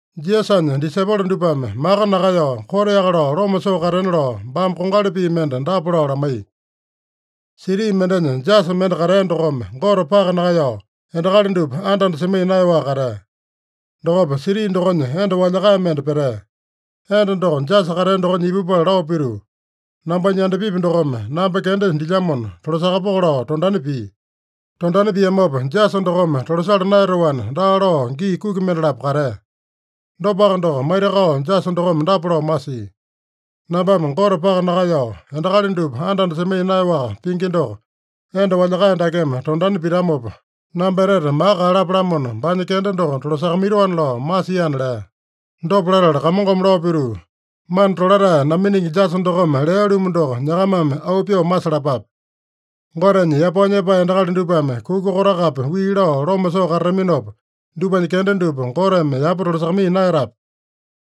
Jisasanya disaipolo dupame maka nakaeyao, koteaka lao loma soo katena lao baame kongali pii mende dapa lao lamaiya: “Siti mendenya jasa mende katea dokome Gote paka nakaeyao, endakali dupa anda-anda semaiya naeyaowaka katea. Dokopa siti dokonya enda walyakae mende petea. Enda doko jasa katea dokonya ipupala lao pituu, ‘Nambanya yandapipi dokome namba kenda dilyamona tolasakapoko’ lao tondani pia. Tondani piamopa, jasa dokome tolasala naeyatoana, daa lao gii kuki mendalapo katea. Dopaka doko, maitakao jasa dokome dapa lao masia: ‘Nambame Gote paka nakaeyao, endakali dupa anda-anda semaiya naeyaowaka pingi doko, enda walyakae dakeme tondani pitamopa, namba etete maka kaeyalapo-lamona, baanya kenda doko tolasakamaitoana’ lao masiana” lea. Dopa latala Kamongome lao pituu, “Mana tolatae naminingi jasa dokome lea-lumu doko nyakamame auu pyoo masalapape. Gotenya yapao nyepae endakali dupame kuka kotakapi wii lao loma soo katataminopa, dupanya kenda dupa Goteme yapa tolasakamaiya naeyatape?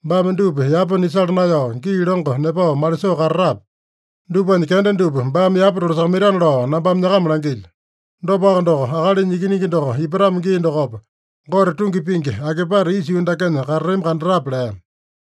Baame dupa yapa nisala naeyao, gii longo nepao malisoo katatape? Dupanya kenda dupa baame yapa tolasakamaitana lao nambame nyakama langilyo. Dopaka doko, Akalinya Ikiningi doko ipatamo gii dokopa, Gote tungi pingi akipate isa yuu dakenya katatami kandatape?” lea.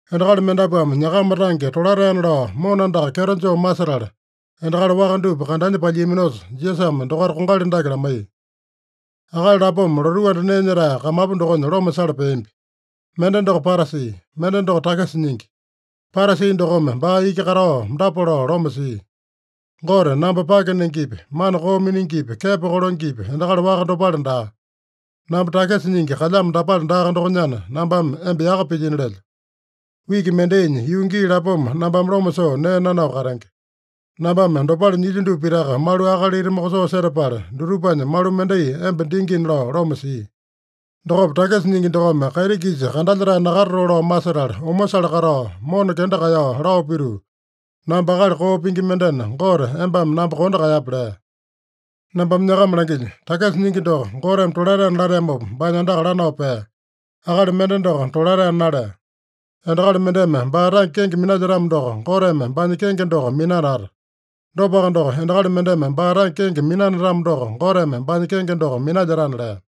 Endakali mendapuame nyakama tange tolataena lao mona andaka kyeto joo masetala, endakali waka dupa kandanya palyiaminosa, Jisasame dokaita kongali dake lamaiya: “Akali lapoma lotuu anda nee nyetae kamapu dokonya loma sala peambi. Mende doko Parasi. Mende doko takisa nyingi. Parasi dokome baa iki katao dapa lao loma sia: ‘Gote, namba pake nengepi, mana koo miningipi, kepo kolengepi, endakali waka dopale daa. Namba takisa nyingi kalyamo dapale daaka dokonyana, nambame emba yaka pilyino lelyo. Wiki mendainya yuu gii lapoma nambame loma soo nee nanao katenge. Nambame dopale nyilyo dupa pitaka malu akalita mokosoo setapala, dutupanya malu mendai emba dingina’ lao loma sia. Dokopa takisa nyingi dokome kaiti-kisa kandalyetae nakatatoo lao masetala, omosale katao, mona kenda kaeyao lao pituu, ‘Namba akali koo pingi mendena, Gote embame namba kondo kaeyape’ lea. Nambame nyakama langilyo: Takisa nyingi doko Goteme tolataena lateamopa baanya andaka lanao pea. Akali mende doko tolataena nalea. Endakali mendeme baa tange kenge minalyetamo doko, Goteme baanya kenge doko minanata. Dopaka doko, endakali mendeme baa tange kenge minanatamo doko, Goteme baanya kenge doko minalyetana” lea.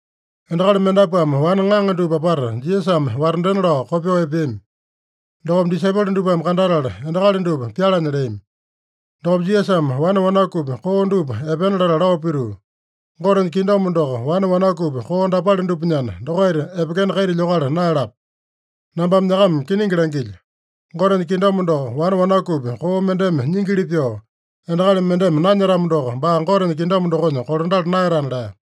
Endakali mendapuame wane ŋaŋa dupa apata Jisasame watandena lao kopyoo epeami. Dokopa disaipolo dupame kandatala, endakali dupa pyalanya leami. Dokopa Jisasame wane wanakupi koo dupa epena latala lao pituu, “Gotenya kingdom doko wane wanakupi koo dapale dupanyana, dokaita epekena kaita lyokala naeyalapa. Nambame nyakama kiningi langilyo: Gotenya kingdom doko wane wanakupi koo mendeme nyingili pyoo, endakali mendeme nanyetamo doko, baa Gotenya kingdom dokonya kolandala naeyatana” lea.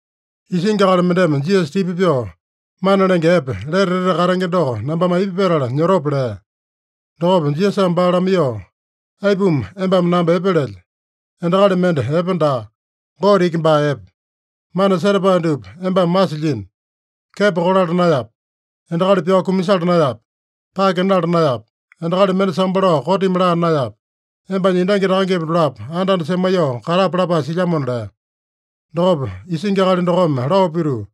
Isingi akali mendeme Jisasa tipa pyoo, “Mana Lenge Epe, lete etete katenge doko nambame aipa petala nyotope?” lea. Dokopa Jisasame baa lamaiyoo, “Aipuma embame namba epe lelye? Endakali mende epe daa. Gote iki baa epe. Mana setapae dupa embame masilyino: Kepo kolala naeyape. Endakali pyao kumasala naeyape. Pake nala naeyape. Endakali mende sambo lao kotimi laa naeyape. Embanya endangi takangepa dolapo anda-anda semaiyoo katape lapae silyamona” lea. Dokopa isingi akali dokome lao pituu,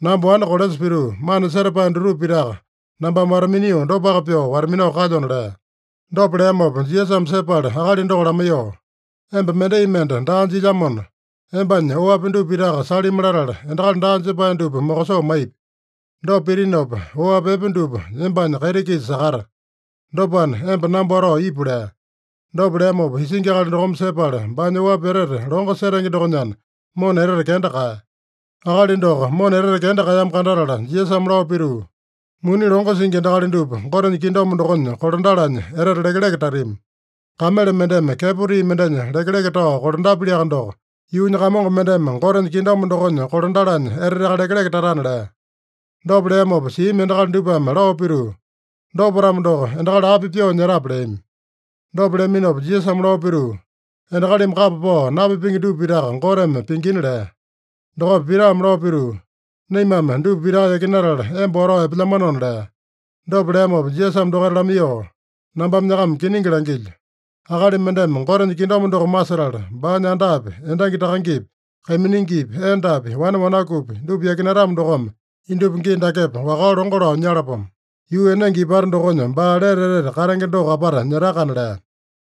“Namba wane kolesa pituu, mana setapae dutupa pitaka nambame wata-minio dopaka pyoo wata-minao kalyona” lea. Dopa leamopa Jisasame sepala akali doko lamaiyoo, “Emba mendai mende daa jilyamona, embanya oapi dupa pitaka salimi latala, endakali daa jepae dupa mokosoo maipi. Dopa pitinopa oapi epe dupa embanya kaiti-kisa sakata. Dopana, emba namba watao ipu” lea. Dopa leamopa isingi akali dokome sepala, baanya oapi etete longo setenge dokonyana, mona etete kenda kaeya. Akali doko mona etete kenda kaeyamo kandatala, Jisasame lao pituu, “Muni longo singi endakali dupa Gotenya kingdom dokonya kolandalanya etete lekeleke tatami. Kamele mendeme kepo tii mendenya lekeleke tao kolandapyaliaka doko, yuunya kamongo mendeme Gotenya kingdom dokonya kolandalanya eteteaka lekeleke tatana” lea. Dopa leamopa siami endakali dupame lao pituu, “Dopa-tamo doko, endakali api pyoo nyetape?” leami. Dopa leaminopa Jisasame lao pituu, “Endakalimi kapa pao napipenge dupa pitaka Goteme pingina” lea. Dokopa Pitame lao pituu, “Naimame dupa pitaka yakinatala emba watao epelyamanona” lea. Dopa leamopa Jisasame dokaita lamaiyoo, “Nambame nyakama kiningi langilyo: Akali mendeme Gotenya kingdom doko masetala, baanya andapi, endangi takangepi, kaiminingipi, endapi, wane wanakupi, dupa yakinatamo dokome, indupa gii dakepa wakao longo lao nyalapomo. Yuu enenge ipata dokonya baa lete etete katenge doko apata nyetakana” lea.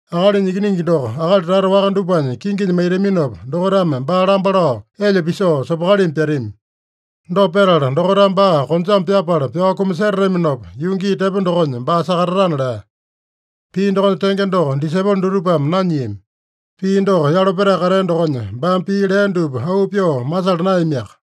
Akalinya Ikiningi doko akali tata waka dupanya kinginya maitaminopa, dokaitame baa lamba lao, elya pisoo, sopokalimi pyatami. Dopa petala, dokaitame baa konjame pyapala pyao kumasetataminopa, yuu gii tepo dokonya baa sakatatana” lea. Pii dokonya tenge doko disaipolo dutupame nanyiami. Pii doko yalo petae katea dokonya, baame pii lea dupa auu pyoo masala naeyamiaka.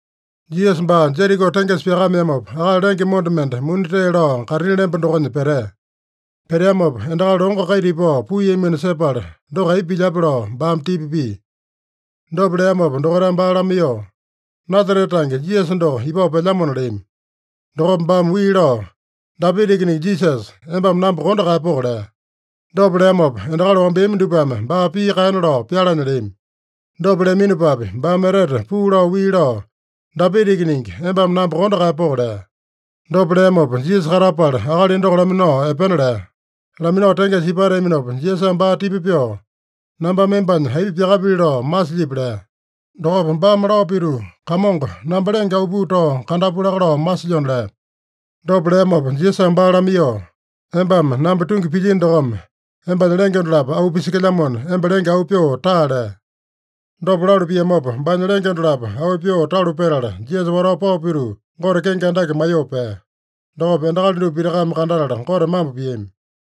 Jisasa baa Jeriko tengesa pyakameamopa, akali lenge monda mende muni tee lao kaitini lemba dokonya petea. Peteamopa, endakali longo kaita ipao puiyamino sepala, doko aipa pilyape lao baame tipa pia. Dopa leamopa dokaitame baa lamaiyoo, “Nasarete tange Jisasa doko ipao pelyamona” leami. Dokopa baame wii lao, “Dapita Ikiningi Jisasa, embame namba kondo kaeyapoko!” lea. Dopa leamopa, endakali wambeami dupame baa pii kaena lao pyalanya leami. Dopa leaminopapi, baame etete puu lao wii lao, “Dapita Ikiningi, embame namba kondo kaeyapoko!” lea. Dopa leamopa Jisasa katapala, akali doko laminao epena lea. Laminao tengesa ipateaminopa, Jisasame baa tipa pyoo, “Nambame embanya aipa pyakapili lao masilyipi?” lea. Dokopa baame lao pituu, “Kamongo, namba lenge auu pyoo tao kandapu laka lao masilyona” lea. Dopa leamopa Jisasame baa lamaiyoo, “Embame namba tungi pilyino dokome, embanya lenge dolapo auu pisekelyamona, emba lenge auu pyoo taa” lea. Dopa lalu piamopa, baanya lenge dolapo auu pyoo talu petala, Jisasa watao pao pituu, Gote kenge andake maiyoo pea. Dokopa endakali dupa pitakame kandatala Gote mambo piami.